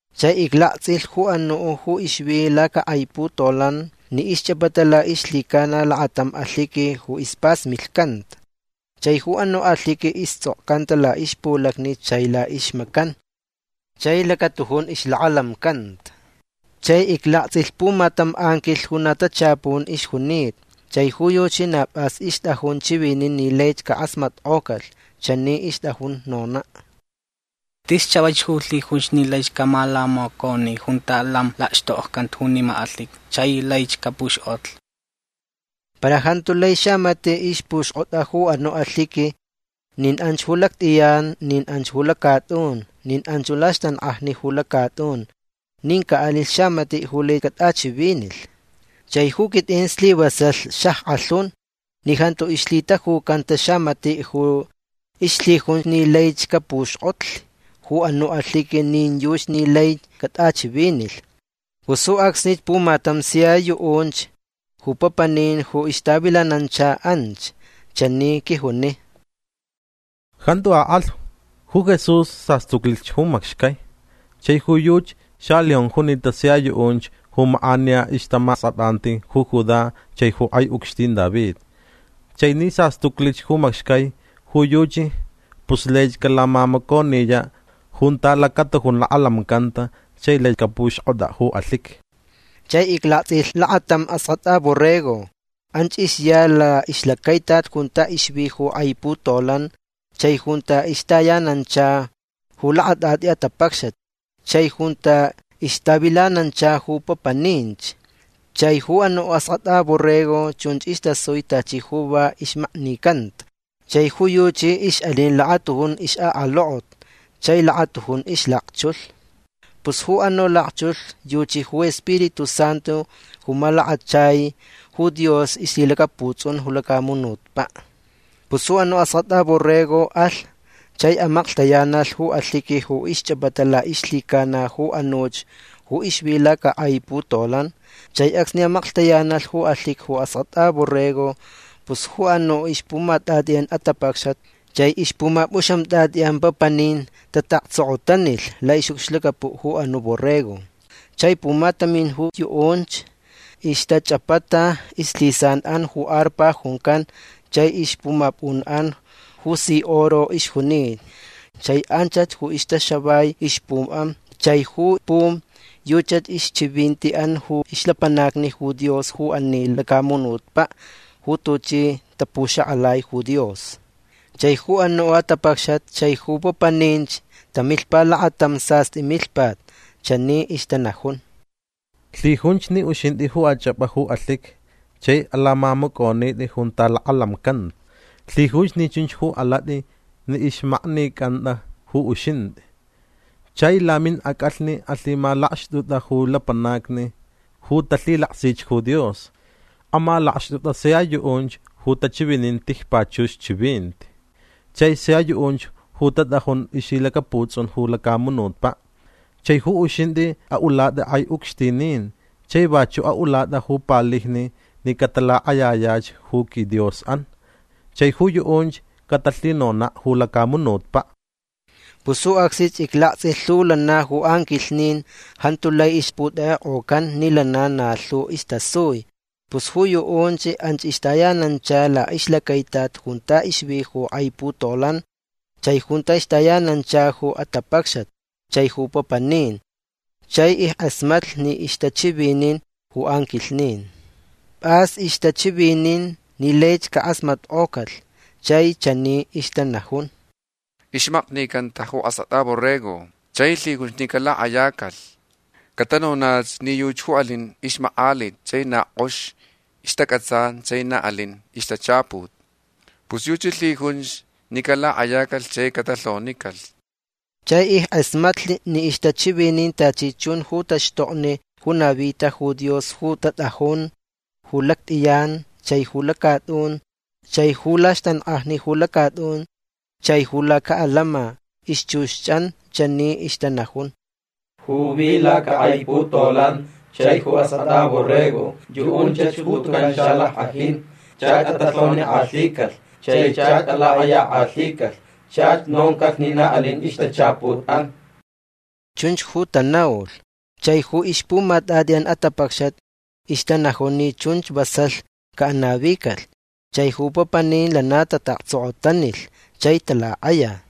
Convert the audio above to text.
Chai iclaktsʼilh ju anuʼ ju ixvi lacakʼai putolan ni ixchʼapata laʼixlhicana lakatam alhiqui ju ispasmilhcanta. Chai ju anuʼ alhiqui istsʼokcanta laʼixpulacni chai laʼixmacan. Chai lacatujun ixlakalamcanta. Chai iclaktsʼilh pumatam anquilh ju na tachapun ixjunita. Chai ju yuchi na pʼas ixtʼajun chiviniʼ ni laich cakʼasmatkʼocalh. Chani ixtʼajun nonaʼ: ―Tis chavaich ju lhijunch ni laich camalamaconi junta lam lakxtokcanta junima alhiqui chai laich capuxkʼotlh. Para jantu lai xamatiʼ ixpuxkʼotʼa ju anuʼ alhiqui. Nin anch ju lactʼiyan nin anch ju lacatʼun nin anch laxtankʼajni ju lacatʼun. Nin caʼalilh xamatiʼ ju lai catʼachivinilh. Chai ju quitʼin slivasalh xackʼalhun ni jantu ixlhitajucanta xamatiʼ ju ixlhijun ni laich capuxkʼotli ju anuʼ alhiqui nin yuchi ni lai catʼachivinilh. Pus ju acsnich pumatam sia yuʼunch ju papanin ju ixtavilanancha anch chani quijuni: ―Jantu akʼalh. Ju Jesús sastuclich ju macxcai. Chai ju yuchi xaleón junita sia yuʼunch ju makʼaniya ixtamaskʼatʼanti ju Judá chai ju kʼai ucxtin David. Chai ni sastuclich ju macxcai ju yuchi pus laich calamamaconiyaʼ junta lacatujun lakalamcanta chai lai capuxkʼotʼaʼ ju alhiqui. Chai iclaktsʼilh lakatam Askʼatʼa Borrego. Anch ixya laʼixlacaitat junta ixvi ju kʼai putolan chai junta ixtayanancha ju lakatʼatʼi atapacxat chai junta ixtavilanancha ju papaninch. Chai ju anuʼ Askʼatʼa Borrego chunch istasui tachi ju va ixmaknicanta. Chai ju yuchi ixʼalin lakatujun ixʼakalokot chai lakatujun ixlakchulh. Pus ju anuʼ lakchulh yuchi ju Spiritu Santu ju malakachai ju Dios ixlhilacaputsʼun ju lacamunutpaʼ. Pus ju anuʼ Askʼatʼa Borrego alh. Chai amaklhtayanalh ju alhiqui ju ixchʼapata laʼixlhicana ju anuch ju ixvi lacakʼai putolan. Chai acsni amaklhtayanalh ju alhiqui ju Askʼatʼa Borrego pus ju anuʼ ixpumatʼatʼiʼan atapacxat chai ixpumapʼuxamtʼatʼiʼan papanin tataʼaktsokotanilh laʼixʼucxlacapuʼ ju anuʼ Borrego. Chai pumatamin ju yuʼunch ixtachʼapata ixlhisanʼan ju arpa juncan chai ixpumapʼunʼan ju si oro ixjunita. Chai anchach ju ixtaxavai ixpumʼan. Chai ju pum yuchach ixchivintiʼan ju ixlapanacni Dios ju ani lacamunutpaʼ ju tuchi tapuxakʼalai ju Dios. Chai ju anuʼ atapacxat chai ju papaninch tamilhpa lakatam sastʼi milhpat. Chani ixtanajun: Lhijunch ni uxintʼi ju achʼapʼa ju alhiqui chai alamamacʼonitʼi junta lakalamcanta. Lhijunch ni chunch ju alatʼi ni ixmaknicʼantʼa ju uxintʼi. Chai laminʼacʼalhni alhimalakxtʼutʼa ju lapanacni ju talhilaksich ju Dios. Amalakxtʼutʼa sia yuʼunch ju tachivinin tijpachux chivinti chai sia yuʼunch ju tatʼajun ixlhilacaputsʼun ju lacamunutpaʼ. Chai ju uxintʼi aʼulatʼa kʼai ucxtinin. Chai vachuʼ aʼulatʼa ju palijni ni catalakʼayayach ju quiDiosʼan. Chai ju yuʼunch catalhinonaʼ ju lacamunutpaʼ. Pus ju acsnich iclaktsʼilh lhu lana ju anquilhnin. Jantu lai ixputekʼekʼocan ni lana na lhu istasui. Pus ju yuʼunch anch ixtayanancha laʼixlacaitat junta ixvi ju kʼai putolan chai junta ixtayanancha ju atapacxat chai ju papanin. Chai ickʼasmatlh ni ixtachivinin ju anquilhnin. Pʼas ixtachivinin ni laich cakʼasmatkʼocalh. Chai chani ixtanajun: Ixmaknicanta ju Askʼatʼa Borrego. Chai lhijunch ni calakʼayacalh. Catanonach ni yuchi ju alin ixmakʼalit chai na kʼox ixtacʼatsan chai na alin ixtachaput. Pus yuchi lhijunch ni calakʼayacalh chai catalhonicalh. Chai ickʼasmatlh ni ixtachivinin tachi chun ju taxtokni ju navita ju Dios ju tatʼajun ju lactʼiyan chai ju lacatʼun chai ju laxtankʼajni ju lacatʼun chai ju lacaʼalama. Ixchuxʼan chani ixtanajun: Ju vi lacakʼai putolan chai ju Askʼatʼa Borrego yuʼunchach ju tucan xalackʼajin. Chach atalhonikʼalhicalh. Chai chach alakʼayakʼalhicalh. Chach noncalh ni na alin ixtachaputʼan. Chunch ju tanaulh. Chai ju ixpumatʼatʼiʼan atapacxat ixtanajun ni chunch vasalh caʼanavicalh. Chai ju papanin lana tataʼaktsokotanilh. Chai talakʼaya.